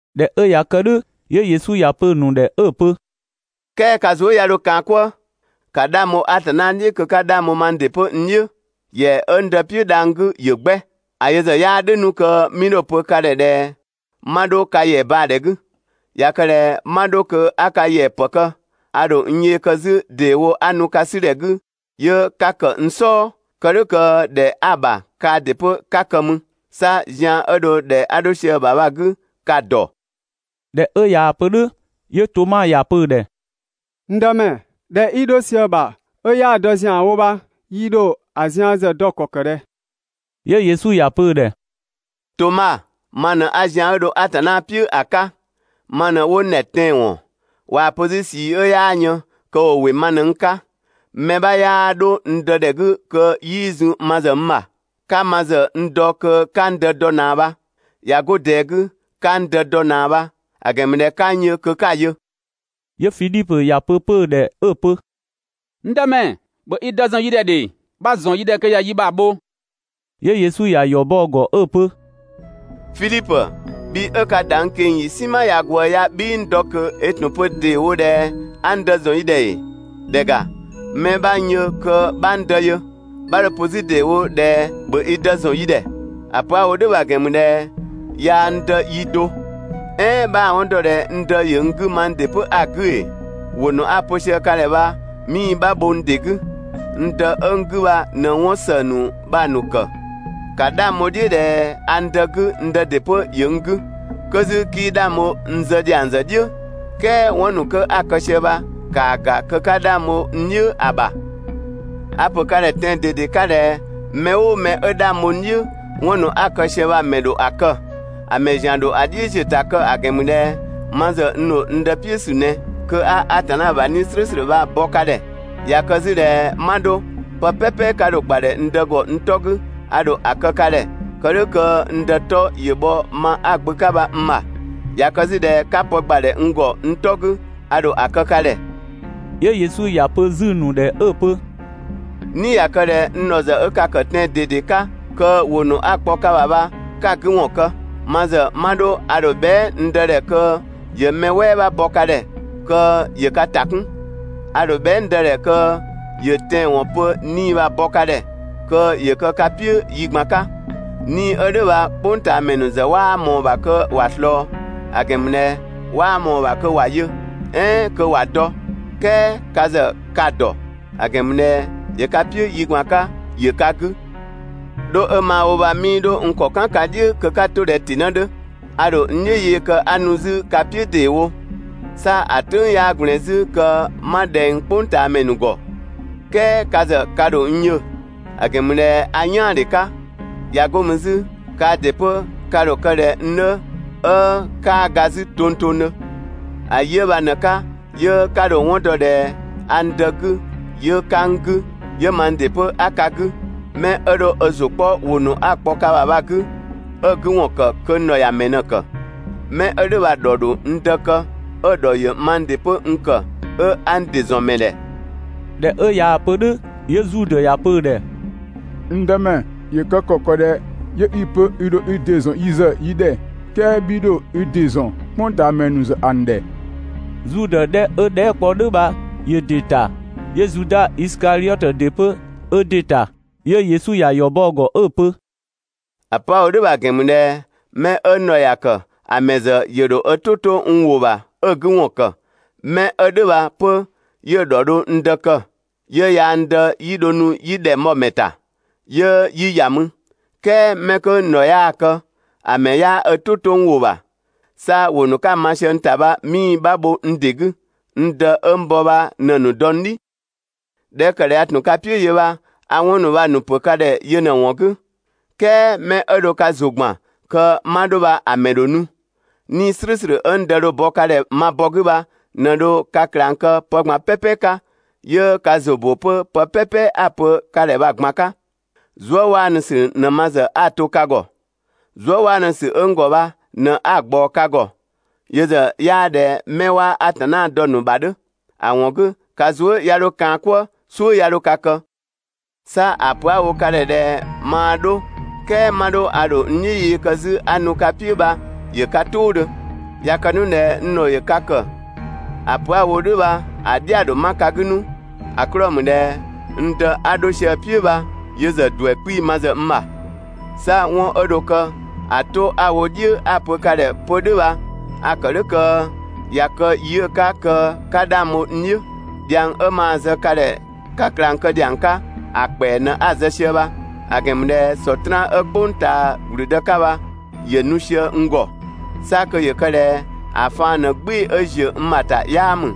꞊Dhɛ 'ö ꞊ya kë "dhʋ̈ 'yö Yesu ‑ya pö‑ ‑nu ‑dhɛ 'ö‑ pö: "Kɛɛ ka zuë" 'ya 'dho kaan‑ "kwëë. ‑Ka 'dhang bho Atanna "dhiʋ̈ kö 'ka 'dhang bho mang ‑dɩ 'pö n "dhiʋ̈! ‑Yɛa 'ö n Dë "piʋ̈ dhang‑ 'gü ‑yö 'gbɛ. ‑A yö ‑zë 'yaa "dhʋ̈ 'nu kö 'mii 'dho‑ pö ka ‑dhɛ ꞊dhɛ 'ma 'dho ka ‑yɛa baa‑ ‑dhɛ 'gü. ꞊Ya kë ꞊dhɛ 'ma 'dho kö 'a ka ‑yɛa ‑pë kë, a ‑dho n yee kë 'zü ‑deewo a ‑nu ka 'sü ‑dhɛ 'gü 'yö 'ka ‑kë n "sɔɔ, kë "dhʋ̈ kö ‑dhɛ 'a‑ ‑bha kaa ‑dɩ 'pö 'ka kë mü. 'Sa zian 'ö dho ‑dhɛ 'a 'dho sië‑ ‑bha bha‑ 'gü ka‑ ‑dɔ.» ꞊Dhɛ 'ö ꞊yaa‑ pö "dhʋ̈ 'yö Toma ‑ya pö‑ ‑dhɛ: «N Dëmɛ, ‑dhɛ 'i 'dho sië‑ ‑bha 'ö 'yaa‑ dɔ ‑zianwo bha yi ‑dho ‑a zian ‑zë dɔ ‑kɔ kë ꞊dhɛ?» 'Yö Yesu ‑ya pö‑ ‑dhɛ: «Toma, ma ꞊në 'a zian 'ö dho Atanna "piʋ̈ ‑a 'ka, ma ꞊në 'wo n ‑dhɛ tɛanwɔn, ꞊waa‑ pö 'zü ꞊sii 'ö 'yaa yën, kö ‑wo ‑wɩ ma ꞊në n 'ka. Mɛ 'bha 'yaa 'dho n Dë ‑dhɛ 'gü kö 'yii zun ma ‑zë n ‑bha. 'Ka ma ‑zë n dɔ kö 'ka n Dë dɔ ꞊naa bha. ꞊Ya 'go ꞊dɛɛ 'gü, 'ka n Dë dɔ ꞊naa bha, ‑a ‑gɛn ‑mü ꞊dhɛ 'ka n yö kö 'ka‑ yö.» 'Yö Fidhipö ‑ya pö‑ 'pö‑ ‑dhɛ 'ö‑ pö: «N Dëmɛ, ‑bhö i Dë ‑zɔn yi ‑dhɛ ‑dhe! 'Bha‑ ‑zɔn yi ‑dhɛ kö ꞊ya yi ‑bha bho.» 'Yö Yesu ‑ya ‑yɔ bɔ‑ ‑gɔ 'ö‑ pö: «Fidhipö, bhi 'ö ka ‑da n ꞊keng‑ ‑yi "sinma ꞊ya ꞊gwëë ya 'bhii n dɔ ꞊kö, i ‑tun pö ‑deewo ꞊dhɛ 'a n Dë ‑zɔn i ‑dhɛ ‑ee? ‑Dhɛ ‑ga, 'mɛ 'bha n yö kö 'bha n Dë yö. 'Bha 'dho‑ pö 'zü ‑deewo ꞊dhɛ «‑bhö i Dë ‑zɔn yi ‑dhɛ». ‑A pö 'a‑ wo "dhʋ̈ bha‑ ‑gɛn ‑mü ꞊dhɛ yaa n Dë yi do. "Ɛɛn 'bhaa‑ 'wɔn dɔ ꞊dhɛ n Dë ‑yö n 'gü mang ‑dɩ 'pö a‑ 'gü ‑ee? ‑Wʋ ‑nu 'a‑ pö sië ka ‑dhɛ bha 'mii‑ 'bha bho n ‑dɩ 'gü! N Dë 'ö n 'gü bha ꞊në 'wɔn ‑së ‑nu bha‑ ‑nu ‑kë. ‑Ka 'dhang bho‑ "dhiʋ̈ ꞊dhɛ a n Dë 'gü n Dë ‑dɩ 'pö ‑yö n 'gü. 'Kö 'zü 'kii 'dhang bho n zë ‑dhiang ‑zë "dhiʋ̈, "kɛɛ 'wɔn ‑nu 'kö 'a‑ kë sië bha ‑kaa ‑ga kö 'ka 'dhang bho n "dhiʋ̈ ‑a ‑bha. A‑ ‑pö ka ‑dhɛ tɛan‑ ꞊dede 'ka ꞊dhɛ: «Mɛ "ʋʋ mɛ 'ö 'dhang bho n "dhiʋ̈, 'wɔn ‑nu 'a‑ kë sië bha‑ ‑mɛ ‑dho ‑a kë. ‑A ‑mɛ ‑zian ‑zë ‑dho ‑a "dhiʋ̈ ‑ziö ‑ta kë, ‑a ‑gɛn ‑mü ꞊dhɛ ma ‑zë n ‑dho n Dë "piʋ̈ ‑sü ꞊nɛ (kö 'a Atanna ‑bha 'Nii‑ "slʋ̈ʋ̈slʋ̈ bha‑ bɔ ka ‑dhɛ). ꞊Ya kë 'zü ꞊dhɛ 'ma 'dho, pë "pɛpɛ 'ka dho‑ ‑gbadhɛ n Dë ‑gɔ n 'tɔ 'gü a ‑dho ‑a kë ka ‑dhɛ, kë "dhʋ̈ kö n Dë 'tɔ ‑yö bhɔ ma 'a‑ Gbö 'ka bha n ‑bha. ꞊Ya kë 'zü ꞊dhɛ 'ka pë ‑gbadhɛ n ‑gɔ n 'tɔ 'gü a ‑dho ‑a kë ka ‑dhɛ.» 'Yö Yesu ‑ya pö 'zü‑ ‑nu ‑dhɛ 'ö‑ pö: «"Ni ꞊ya kë ꞊dhɛ n ‑dhɔ ‑zë 'ö ka ‑kë tɛan‑ ꞊dede 'ka, kö ‑wʋ ‑nu 'a‑ kpɔ ka ‑bha bha 'ka‑ 'gü ‑wɔn kë. Ma ‑zë 'ma 'dho a ‑dho bhɛa" n Dë ‑dhɛ kö ‑yö mɛ "wɛɛ bha bɔ ka ‑dhɛ kö ‑yö ka ‑ta 'kun. A ‑dho bhɛa" n Dë ‑dhɛ kö ‑yö tɛanwɔn pö 'Nii‑ bha‑ bɔ ka ‑dhɛ kö ‑yö kë ka "piʋ̈ yi ꞊gban 'ka. 'Nii‑ 'ö "dhʋ̈ bha "kpʋngtaamɛ ‑nu ‑zë 'waa ꞊mɔɔ‑ ‑bha kö ‑wa ꞊slɔɔ, ‑a ‑gɛn ‑mü ꞊dhɛ 'waa ꞊mɔɔ‑ ‑bha kö ‑wa yö, "ɛɛn kö ‑wa dɔ. "Kɛɛ ka ‑zë ka‑ ‑dɔ, ‑a ‑gɛn ‑mü ꞊dhɛ ‑yö ka "piʋ̈ yi ꞊gban 'ka, ‑yö ka 'gü. 'Dho 'ö maa‑ wo bha 'mii 'dho n ‑kɔ "kan ka "dhiʋ̈ kö 'ka to ꞊dhɛ ‑tɩnë 'dhö, a ‑dho n "dhiʋ̈ yee kë 'a nu 'zü ka "piʋ̈ ‑deewo. 'Sa ‑a "tʋ̈ng 'yaa ꞊gblɛɛn 'zü kö 'ma ꞊dhɛng "kpʋngtaamɛ ‑nu ‑gɔ, "kɛɛ ka ‑zë ka ‑dho n yö, ‑a ‑gɛn ‑mü ꞊dhɛ a "yaandhe 'ka, ꞊ya 'go mü 'zü kaa ‑dɩ 'pö ka ‑dho kë ꞊dhɛ n 'dhö 'ö 'kaa ga 'zü tongtongdhö. ‑A yi 'ö bha ꞊në‑ 'ka, 'yö 'ka dho‑ 'wɔn dɔ ꞊dhɛ a n Dë 'gü, 'yö 'ka n 'gü, 'yö mang ‑dɩ 'pö 'a ka 'gü. 'Mɛ 'ö dho ö ‑zʋ 'kpɔ ‑wʋ ‑nu 'a‑ kpɔ ka ‑bha bha‑ 'gü, 'ö‑ 'gü ‑wɔn ‑kë kö n ‑dhɔ ‑ya ‑mɛ ꞊në‑ ‑kë. 'Mɛ 'ö "dhʋ̈ bha‑ ‑dhɔ ‑dho n Dë kë 'ö‑ ‑dhɔ ‑yö mang ‑dɩ 'pö n ‑kë 'ö 'a n ‑dɩ ‑zɔn ‑mɛ ‑dhɛ. ꞊Dhɛ 'ö ꞊yaa‑ pö "dhʋ̈ 'yö Zudë ‑ya pö‑ ‑dhɛ: «N Dëmɛ, ‑yö kë ‑kɔ ‑kë ꞊dhɛ 'yö 'i‑ pö i ‑dho i ‑dɩ ‑zɔn yi ‑zë yi ‑dhɛ "kɛɛ 'bhii 'dho i ‑dɩ ‑zɔn "kpʋngtaamɛ ‑nu ‑zë ‑a ‑nu ‑dhɛ?» Zudë 'dhɛ 'ö dhɛɛ" kpɔ "dhʋ̈ bha ‑yö ‑dɩ ‑ta 'yö Zuda Isikadhiɔtö ‑dɩ 'pö 'ö ‑dɩ ‑ta. 'Yö Yesu ꞊ya ‑yɔ bɔ‑ ‑gɔ 'ö‑ pö: «‑A pö 'a‑ wo "dhʋ̈ bha‑ ‑gɛn ‑mü ꞊dhɛ 'mɛ 'ö n ‑dhɔ ‑ya ‑kë ‑a ‑mɛ ‑zë ‑yö ‑dho ö "tʋ 'to n ‑wʋ ‑bha 'ö‑ 'gü ‑wɔn ‑kë, 'mɛ 'ö "dhʋ̈ bha 'pö 'yö‑ ‑dhɔ dho n Dë kë, 'yö yaa n Dë 'yi dho nu yi ‑dhɛng bhɔ‑ ‑mɛ ‑ta 'yö 'yi ‑ya mü. "Kɛɛ 'mɛ 'kö n ‑dhɔ 'yaa‑ kë, ‑a ‑mɛ 'yaa ö "tʋ 'to n ‑wʋ ‑bha. 'Sa ‑wʋ ‑nu 'ka‑ ma sië n ‑ta bha 'mii‑ 'bha bho n ‑dɩ 'gü. N Dë 'ö n bɔ bha ꞊në‑ ‑nu dɔ n "dhi. ꞊Dhɛ 'ö ‑kë ꞊dhɛ a ‑tun ka "piʋ̈ yö bha a 'wɔn ‑nu bha‑ ‑nu ‑pö ka ‑dhɛ 'yö ꞊në‑ ‑wɔn 'gü. "Kɛɛ 'mɛ 'ö dho ka ‑zʋ gban kö 'ma 'dho bha‑ ‑mɛ ‑dho nu. 'Nii‑ "slʋ̈ʋ̈slʋ̈ 'ö n Dë dho‑ bɔ ka ‑dhɛ ma bɔ 'gü bha ꞊në dho ka ꞊klang kë pë ꞊gban "pɛpɛ 'ka, 'yö ka ‑zʋ ‑bö 'pö pë "pɛpɛ 'a‑ pö ka ‑dhɛ bha‑ ꞊gban 'ka. Zuëwaanusü ꞊në ma ‑zë 'a‑ to ka ‑gɔ. Zuëwaanusü 'ö n ‑gɔ bha ꞊në 'a‑ ꞊gbaɔ ka ‑gɔ. Yö ‑zë 'yaa ꞊dhɛ 'mɛ 'waa Atanna dɔ‑ ‑nu ‑bha 'dhö. ‑A ‑wɔn 'gü ka zuë" 'ya 'dho kaan‑ "kwëë, "suʋ̈ 'ya 'dho ka kë! 'Sa ‑a pö 'a‑ wo ka ‑dhɛ ꞊dhɛ «maa 'dho "kɛɛ 'ma 'dho a ‑dho n "dhiʋ̈ yee kë 'zü 'a nu ka "piʋ̈» bha ‑yö ka "tʋʋdhö. ꞊Ya kë 'nu ꞊dhɛ n ‑dhɔ ‑yö ka ‑kë kö ‑a pö 'a‑ wo "dhʋ̈ bha‑ "dhia‑ ‑dho 'ma ka 'gü 'nu, ‑a 'klɔɔ‑ ‑mü ꞊dhɛ n Dë 'a 'dho sië‑ "piʋ̈ bha yö ‑zë ‑duɛ 'kpii‑ ma ‑zë n ‑bha. 'Sa 'wɔn 'ö dho kë ‑a 'to 'a‑ wo "dhiʋ̈ 'a‑ pö ka ‑dhɛ 'pö "dhʋ̈ bha, a‑ ‑kë "dhʋ̈ kö ꞊ya kë yi 'ö‑ 'ka kö 'ka 'dhang bho n "dhiʋ̈. Dhiang 'ö maa‑ zë ka ‑dhɛ ka ꞊klang kë ‑dhiang 'ka ‑a ‑kpɛa ꞊në 'a‑ zë sië bha, ‑a ‑gɛn ‑mü ꞊dhɛ Sɔtraan 'ö "kpʋng ꞊taa ‑gblüdë 'ka bha ‑yö nu sië n ‑gɔ. 'Sa kö ‑yö kë ꞊dhɛ ‑a faan ꞊në "gbɩɩ‑ 'ö ‑ziö n ‑bha ‑ta 'yaa ‑mü.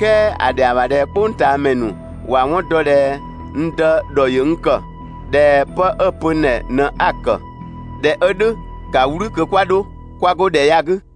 "Kɛɛ ‑a ‑dhɛa ‑bha ꞊dhɛ "kpʋngtaamɛ ‑nu ‑wa 'wɔn dɔ ꞊dhɛ n Dë ‑dhɔ ‑yö n ‑kë, ꞊dhɛ 'pë 'ö‑ pö n ‑dhɛ ꞊në 'a‑ ‑kë. ꞊Dhɛ 'ö "dhʋ̈ ‑ka "wlü kö 'kwa 'dho 'kwa 'go ‑dhɛ ya 'gü!»